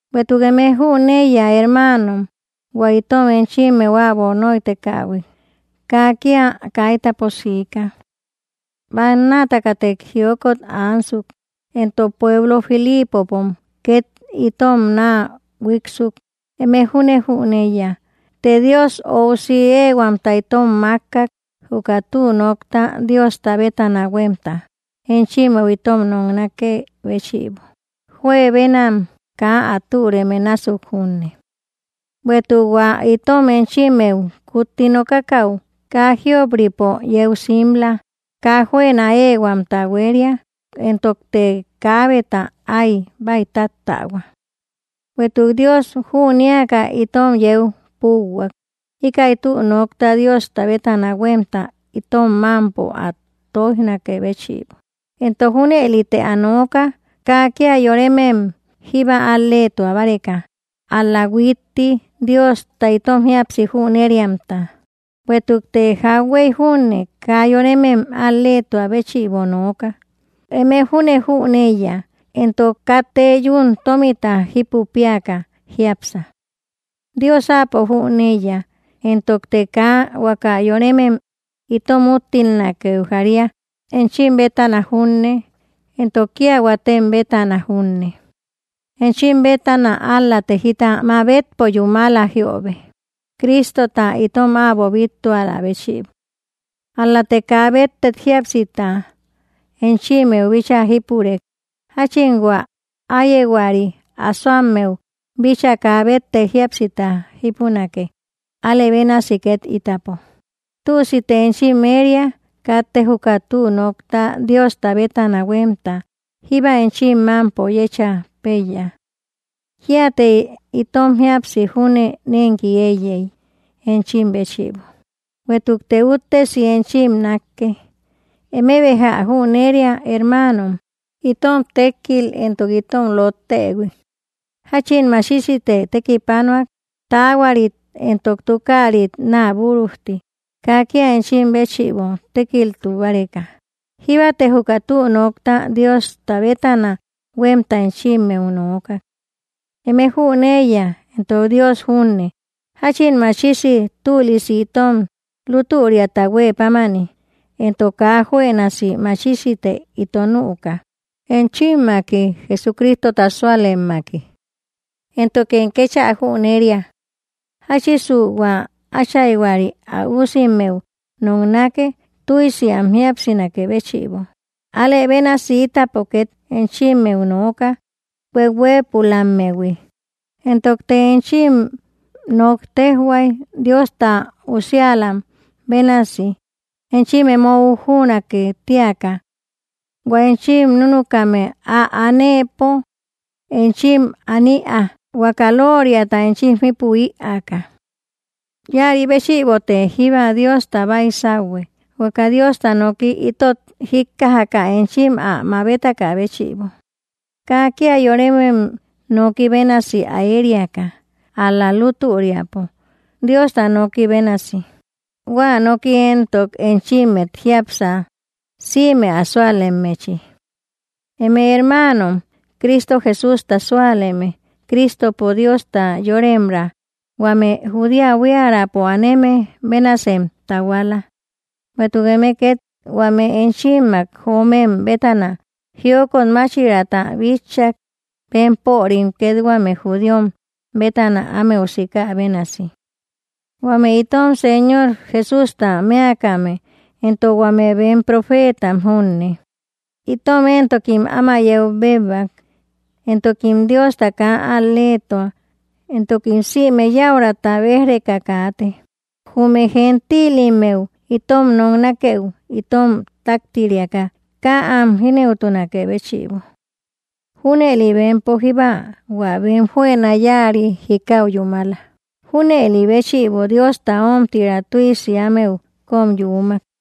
Bueïtuk eme jüneiya, hermaanom, hua itom enchimmeu äbo nóitekähui kaa kía kaitapo siika. Bannaatakate jiokot ansuk, entok pueblo Filiipopom két itom naa huíiksuk. Eme júne jüneiya, të Dios óusi éehuamta itom mákkak, juka tü nokta Diosta bétana huémta enchimmeu itom noknakë béchïbo, juebenam kaa ä türeme násuk junne. Bueïtuk hua itom enchimmeu kutti nokakäu kaa jíop‑ripo yeu simla; kaa juëna éehuamta huéria, entokte kaabeta áy bäitattähua. Bueïtuk Dios jünéaka itom yeu púuhuak, íkäi tü nokta Diosta bétana huémta itom mámpo ä tóijnakë béchïbo; entok junëlite ä nooka, kaa kía yoremem jíba al‑leetua báreka, ál‑la huitti Diosta itom jíapsi jüneriamta. Bueïtukte jauhuey júne kaa yoremem al‑leetua béchïbo nooka; eme júne jüneiya. Entok katte yún tómita jípu péaka jiápsa; Dios Áapo jüneiya. Entokte kaa huaka yoremem itom úttilnakeu jaria, enchim bétana junne, éntok kía huatem bétana junne; enchim bétana ál‑late jita mabetpo yúmala jiöbe, Crístota itom äbo bíttualä béchïbo. Ál‑late kaa béttek jíapsita enchimmeu bíchaa jípurek; jáchin hua áyehuari ä asoammeu bíchaa kaa béttek jíapsita jípunake, alë bénasi két ítapo. Tüsite enchim éria; katte juka tü nokta Diosta bétana huémta jíba enchim mámpo yécha péiya. Kíate itom jíapsi júne nénki éiyey, enchim béchïbo, bueïtukte úttesi enchim nákke. Eme béja ä jüneria, hermaanom, itom tékkil entok itom lottëhui, jáchin machisite tekipanuak, taahuarit entok tukaarit naa búrujti, kaa kía enchim béchïbo tékiltu báreka. Jíbate juka tü nokta Diosta bétana huémta enchimmeu nookak. Eme jüneiya, entok Dios junne, jáchin machisi tülisi entok lútüriata huë pámani entok kaa juënasi machisite ito nüka enchimmaki, Jesucristota súalemmaki. Éntokem kéchä jüneria, jáchisu hua áchaihuari ä usimmeu noknake tüsi am jíapsinakë béchïbo, alë bénasi ítapo ket enchimmeu nooka, hueuhuëpulammehui, entokte enchim nok téjhuay, Diosta usiälam bénasi enchim emo ujünake tíaka. Huä enchim núnukame ä anëpo enchim an ïaa, huaka lóoriata enchim jípü ïaaka. Íäri béchïbote jíba Diosta baisauhue, huaka Diosta noki itot jíkkajaka enchim ä mabetakä béchïbo, kaa kía yoremem noki bénasi ä ériaka, ál‑la lútüriapo Diosta noki bénasi. Huä noki éntok enchimmet jiápsa, sïme ä súalemmechi. Eme hermaanom, Cristo Jesústa súaleme, Cristopo Diosta yoremraa huame Judea buiärapo aneme bénasem tahuala; bueïtuk eme két huame enchimmak joomem bétana jiokot máchiraata bitchak, bempörim két huame judíom bétana ámeu sikä bénasi. Huame itom Señor Jesústa mëakame éntok huame bem profeetam junne, itom éntokim áma yeu béebak. Entokim Diosta kaa al‑leetua, entokim sïme yäuraata béj‑reka kaate, jume gentílimmeu itom noknakeu itom táktiriaka kaa am jínëutunakë béchïbo. Júnëli bempo jíba hua bem juëna yáari jikau yúmala. Júnëli béchïbo Diosta ómtira tüisi ámeu kóm yuumak.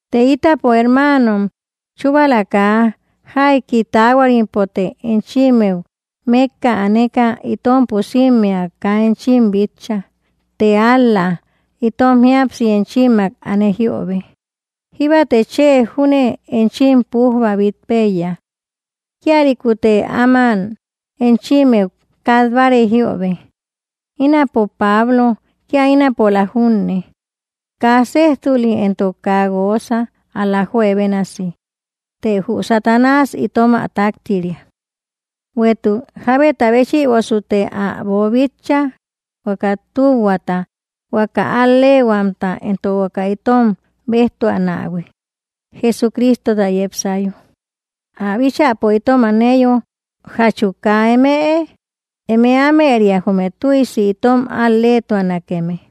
Të itapo, hermaanom, chúbala kaa jaiki taahuarimpote enchimmeu mékka aneka itom pusimmea kaa enchim bitcha, të ál‑la itom jíapsi enchimmak ane jiöbe, jíbate chë júne enchim pújba bít péiya. Kíalïkute áman enchimmeu kat báarey jiöbe, ínapo Pablo, kía ínapola junne, kaa séjtuli entok kaa guoosa, ál‑la juebénasi; të jü Satanás itom ä táktiriak. Bueïtuk, ¿jábeta béchïbosute ä boobíchaïhui, huaka tühuata, huaka al‑leehuamta, entok huaka itom béjtuanähui, Jesucristota yepsayo, ä bíchäpo itom aneyo? ¿Jachu kaa emëe? Eme ámëria jume tüisi itom al‑leetuanakeme.